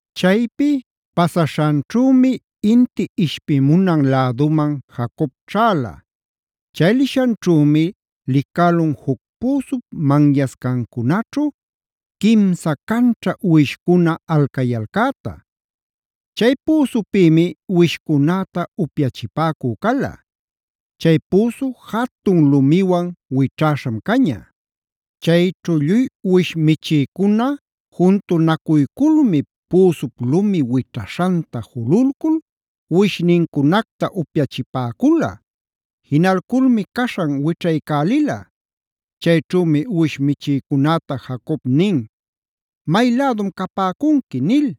Chaypi pasaśhanćhümi inti ishpimunan läduman Jacob ćhäla. Chay lishanćhümi licälun juc püsup manyascancunaćhu quimsa canćha uwishcuna alcayalcäta. Chay püsupïmi uwishcunäta upyachipäcü cala. Chay püsu jatun lumiwan wićhäśham caña. Chayćhu lluy uwish michïcuna juntunacuyculmi, püsup lumi wićhaśhanta jululcul uwishnincunacta upyachipäcula. Jinalculmi caśhan wićhaycälila. Chayćhümi uwish michïcunäta Jacob nin: “¿May lädum capäcunqui?” nil.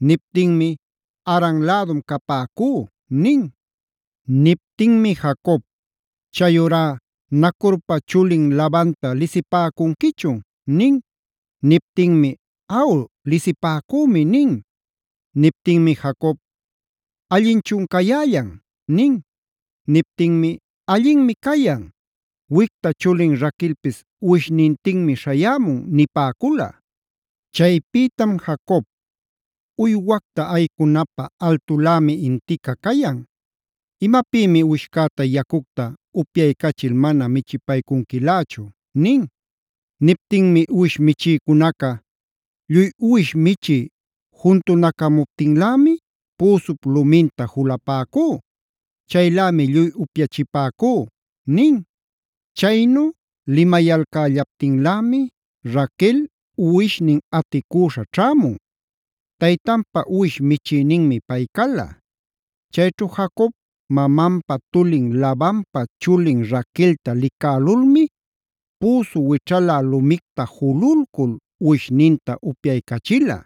Niptinmi: “Haran lädum capäcú” nin. Niptinmi Jacob: “Chayurá ¿Nacorpa chulin Labanta lisipäcunquichun?” nin. Niptinmi: “Aw, lisipäcümi” nin. Niptinmi Jacob: “¿Allinchun cayällan?” nin. Niptinmi: “Allinmi cayan; wicta chulin Raquelpis uwishnintinmi śhayämun” nipäcula. Chaypïtam Jacob: “Uywacta aycunapä altulämi intica cayan. ¿Imapïmi uwishcäta yacucta upyaycachil mana michipaycunquilächu?” nin. Niptinmi uwish michïcunaca: “Lluy uwish michï juntunacamuptinlämi püsup luminta julapäcú. Chaylämi lluy upyachipäcú” nin. Chaynu limayalcällaptinlämi Raquel uwishnin aticüśha ćhämun. Taytanpa uwish michïninmi pay cala. Chayćhu Jacob mamanpa tulin Labanpa chulin Raquelta licälulmi püsu wićhala lumicta jululcul uwishninta upyaycachila.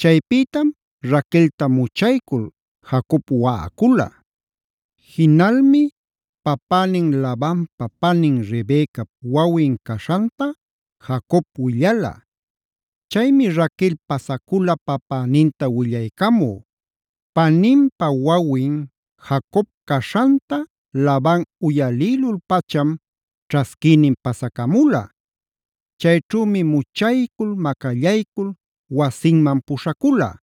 Chaypïtam Raquelta muchaycul Jacob waꞌacula. Jinalmi papänin Labanpa panin Rebecap wawin caśhanta Jacob willala. Chaymi Raquel pasacula papäninta willaycamü. Paninpa wawin Jacob caśhanta Laban uyalïlul-pacham ćhasquïnin pasacamula. Chayćhümi muchaycul macallaycul wasinman puśhacula.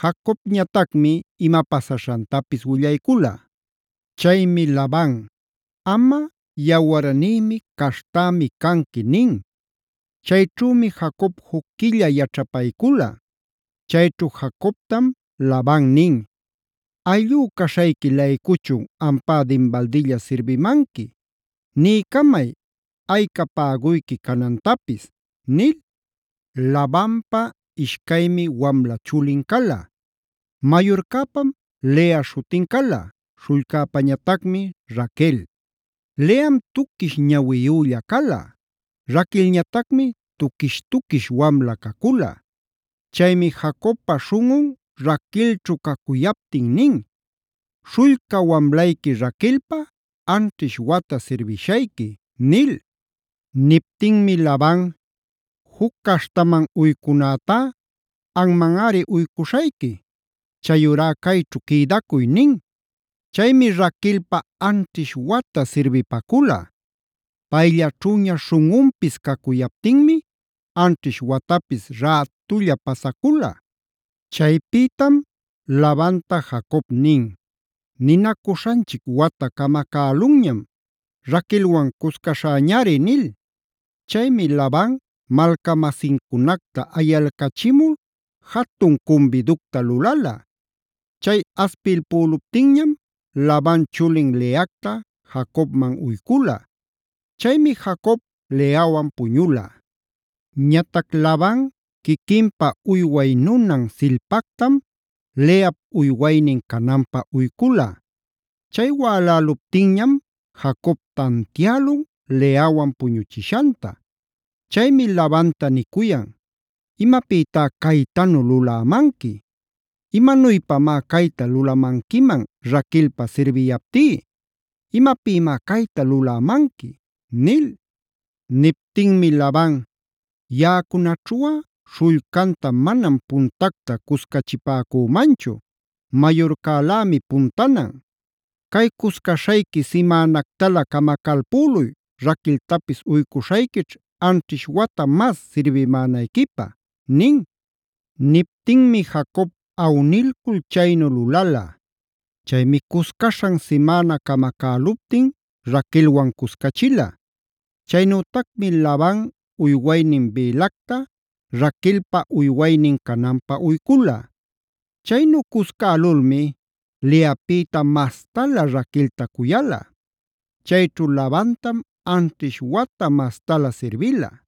Jacobñatacmi ima pasaśhantapis willaycula. Chaymi Laban: “Amꞌa yawarnïmi, caśhtämi canqui” nin. Chayćhümi Jacob juc quilla yaćhapaycula. Chayćhu Jacobtam Laban nin: “¿Ayllú caśhayqui-laycuchun ampá dinbaldilla sirbimanqui? Niycamay, ayca päguyqui canantapis” nil. Labanpa ishcaymi wamla chulin cala: Mayurcäpam Lea śhutin cala, śhullcäpäñatacmi Raquel. Leam tuquish ñawiyülla cala; Raquelñatacmi tuquish-tuquish wamla cacula. Chaymi Jacobpa śhunꞌun Raquelćhu cacuyaptin nin: “Śhullca wamlayqui Raquelpä, anćhish wata sirbishayqui” nil. Niptinmi Laban: “Juc caśhtaman uycunätá anmanꞌari uycuśhayqui. Chayurá cayćhu quïdacuy” nin. Chaymi Raquelpä anćhish wata sirbipacula. Payllaćhüña śhunꞌunpis cacuyaptinmi anćhish watapis rätulla pasacula. Chaypïtam Labanta Jacob nin: “Ninacuśhanchic wata camacälunñam; Raquelwan cuscaśhäñari” nil. Chaymi Laban malca-masincunacta ayalcachimul jatun cumbiducta lulala. Chay aspilpüluptinñam Laban chulin Leacta Jacobman uycula. Chaymi Jacob Leawan puñula. Ñatac Laban quiquinpa uyway nunan Zilpactam Leap uywaynin cananpä uycula. Chay wäläluptinñam Jacob tantiälun Leawan puñuchishanta. Chaymi Labanta nicuyan: “¡Imapïtá caytanu lulämanqui! ¿¡Imanuypamá cayta lulamanquiman Raquelpä sirbiyaptí!? ¿¡Imapïmá cayta lulämanqui!?” nil. Niptinmi Laban: “Yaꞌacunaćhuꞌa śhullcanta manam puntacta cuscachipäcümanchu. Mayurcalämi puntanan. Cay cuscaśhayqui simänactalä camacalpüluy, Raqueltapis uycuśhayquićh anćhish wata mas sirbimänayquipä” nin. Niptinmi Jacob awnilcul chaynu lulala. Chaymi cuscaśhan simäna camacäluptin Raquelwan cuscachila. Chaynütacmi Laban uywaynin Bilhacta Raquelpa uywaynin cananpä uycula. Chaynu cuscälulmi Leapïta mastalä Raquelta cuyala. Chayćhu Labantam anćhish wata mastalä sirbila.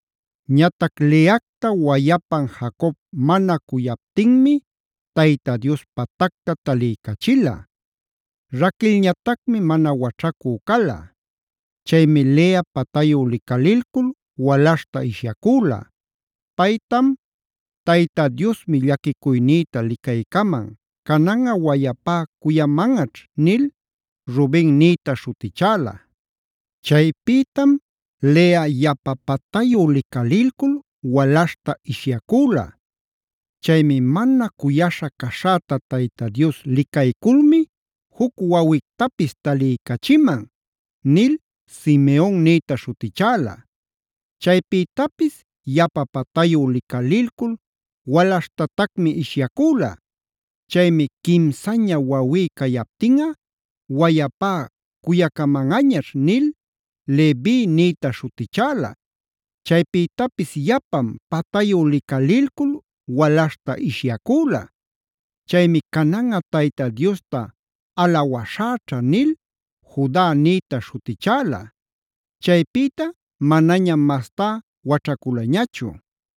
Ñatac Leacta wayapan Jacob mana cuyaptinmi Tayta Dios patacta taliycachila. Raquelñatacmi mana waćhacü cala. Chaymi Lea patayu licalilcul walaśhta ishyacüla. Paytam “Tayta Diosmi llaquicuynïta licaycaman, cananꞌa wayapá cuyamanꞌaćh” nil Ruben nïta śhutichäla. Chaypïtam Lea yapa patayu licalilcul walaśhta ishyacüla. Chaymi “Mana cuyaśha caśhäta Tayta Dios licayculmi juc wawictapis taliycachiman” nil Simeon nïta śhutichäla. Chaypïtapis yapa patayu licalilcul walaśhtatacmi ishyacüla. Chaymi “Quimsaña wawí cayaptinꞌa, wayapá cuyacamanꞌañaćh” nil Levi nïta śhutichäla. Chaypïtapis yapam patayu licalilcul walaśhta ishyacüla. Chaymi “Cananꞌa Tayta Diosta alawaśhäćha” nil Juda nïta śhutichäla. Chaypïta manañam mastá waćhaculañachu.